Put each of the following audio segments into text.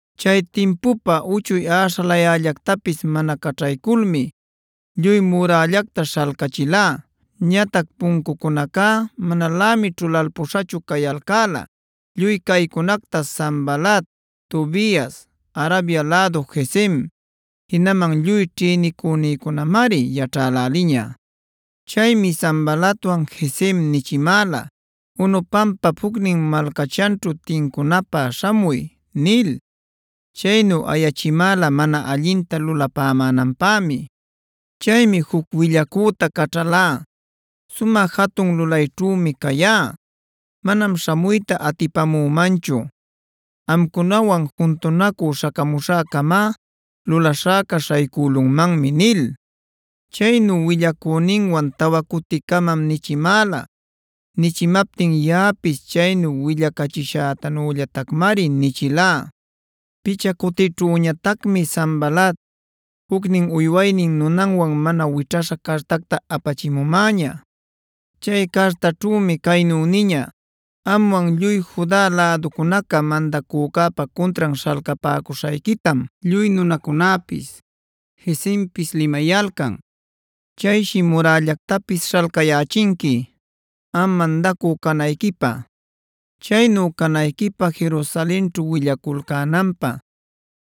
Chay timpupa uchuy aśhalayällactapis mana caćhayculmi lluy murällacta śhalcächilá. Ñatac puncucunacá manalämi ćhulalpuśhachu cayalcäla. Lluy caycunacta Sanbalat, Tobias, Arabia lädu Gesem, jinaman lluy ćhïnicunïcunamari yaćhäläliña. Chaymi Sanbalatwan Gesem nichimäla: “Ono pampap jucnin malcachanćhu tincunäpä śhamuy” nil. Chaynu ayachimäla mana allinta lulapämänanpämi. Chaymi juc willacüta caćhalá: “Sumä jatun lulayćhümi cayá; manam śhamuyta atipamümanchu. Amcunawan juntunacü śhacamuśhäcama lulaśhäca śhaycülunmanmi” nil. Chaynu willacüninwan tawa cuticamam nichimäla. Nichimaptin yaꞌapis chaynu willacachishätanüllatacmari nichilá. Picha cutićhüñatacmi Sanbalat jucnin uywaynin nunanwan mana wićhaśha cartacta apachimumäña. Chay cartaćhümi caynu niña: “Amwan lluy Juda läducunaca mandacücäpa cuntran śhalcapäcuśhayquitam lluy nunacunäpis, Gesempisa limayalcan. Chayshi murällactapis śhalcayächinqui, am mandacü canayquipä. Chaynu canayquipä Jerusalenćhu willaculcänanpä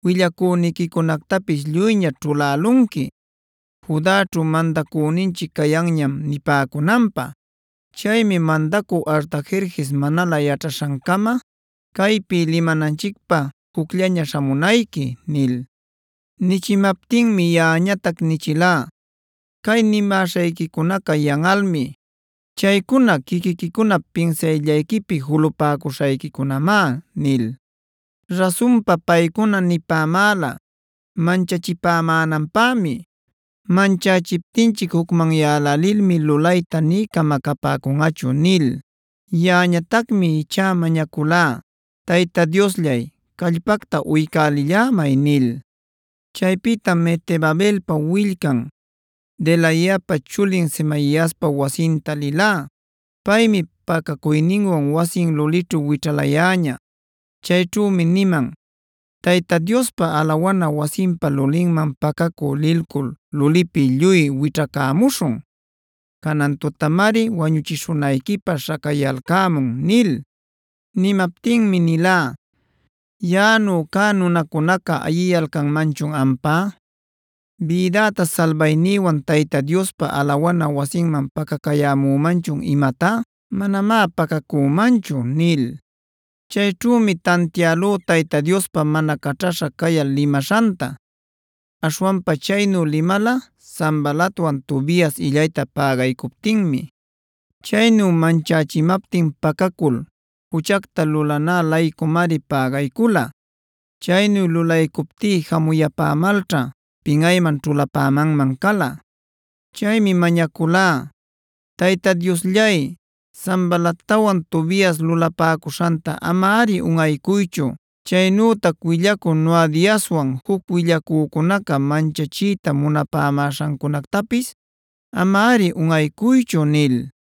willacüniquicunactapis lluyñaśh ćhulälunqui: ‘Judaćhu mandacüninchic cayanñam’ nipäcunanpä. Chaymi mandacü Artajerjes manalä yaćhaśhancama, caypi limananchicpä jucllaña śhamunayqui” nil. Nichimaptinmi yaꞌañatac nichilá: “Cay nimäśhayquicunaca yanꞌalmi. Chaycuna quiquiquicunap pinsayllayquipi julapäcuśhayquicunamá” nil. Rasunpa paycuna nipämäla manchachipämänanpämi: “Manchächiptinchic jucmanyälälilmi lulayta nï camacapäcunꞌachu” nil. Yaꞌañatacmi ichá mañaculá: “Tayta Diosllay, callpacta uycälillämay” nil. Chaypïtam Mehetabelpa willcan, Delaiapa chulin Semaiaspa wasinta lilá. Paymi pacacuyninwan wasin lulićhu wićhalayäña. Chayćhümi niman: “Tayta Diospa alawana wasinpa lulinman pacacü lilcul lulipi lluy wićhacämuśhun. Canan tutamari wañuchishunayquipä śhacayalcämun” nil. Nimaptinmi nilá: “¿¡Yaꞌanu cä nunacunaca ayiyalcanmanchun ampá!? ¿¡Bidäta salbaynïwan Tayta Diospa alawana wasinman pacacuyämanchun imatá!? Manamá pacacümanchu” nil. Chayćhümi tantialú Tayta Diospa mana caćhaśha cayal limaśhanta. Aśhwanpa chaynu limala Sanbalatwan Tobias illayta pägaycuptinmi. Chaynu manchächimaptin pacacul juchacta lulanä-laycumari pägaycula. Chaynu lulaycuptí jamuyapämalćha pinꞌayman ćhulapämanman cala. Chaymi mañaculá: “Tayta Diosllay, Sanbalatwan Tobias lulapäcuśhanta amari unꞌaycuychu. Chaynütac willacü Noadiaswan juc willacücunaca manchachiyta munapämäśhancunactapis amari unꞌaycuychu” nil.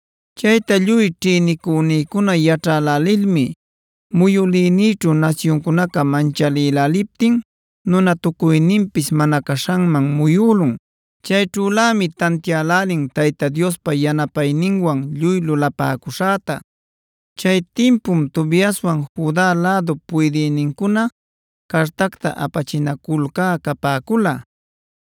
Chayta lluy ćhïnicunïcuna yaćhälälilmi muyülïnïćhu nasyuncunaca manchäläliptin nunatucuyninpis mana caśhanman muyülun. Chayćhülämi tantiälälin Tayta Diospa yanapayninwan lluy lulapäcuśhäta. Chay timpum Tobiaswan Juda lädup puydïnincuna cartacta apachinaculcä capäcula.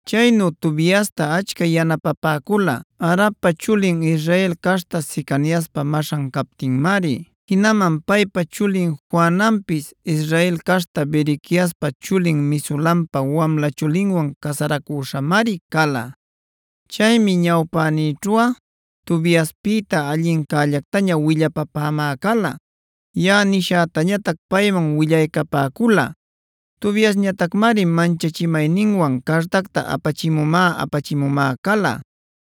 Chaynu Tobiasta achca yanapapäcula Arap chulin Israel caśhta Secaniaspa maśhan captinmari. Jinaman paypa chulin Johananpis Israel caśhta Berequiaspa chulin Mesulampa wamla chulinwan casaracüśhamari cala. Chaymi ñawpänïćhuꞌa Tobiaspïta allinllactaña willapapämä cala; yaꞌa nishätañatac payman willaycapäcula. Tobiasñatacmari manchachimayninwan cartacta apachimumä-apachimumä cala.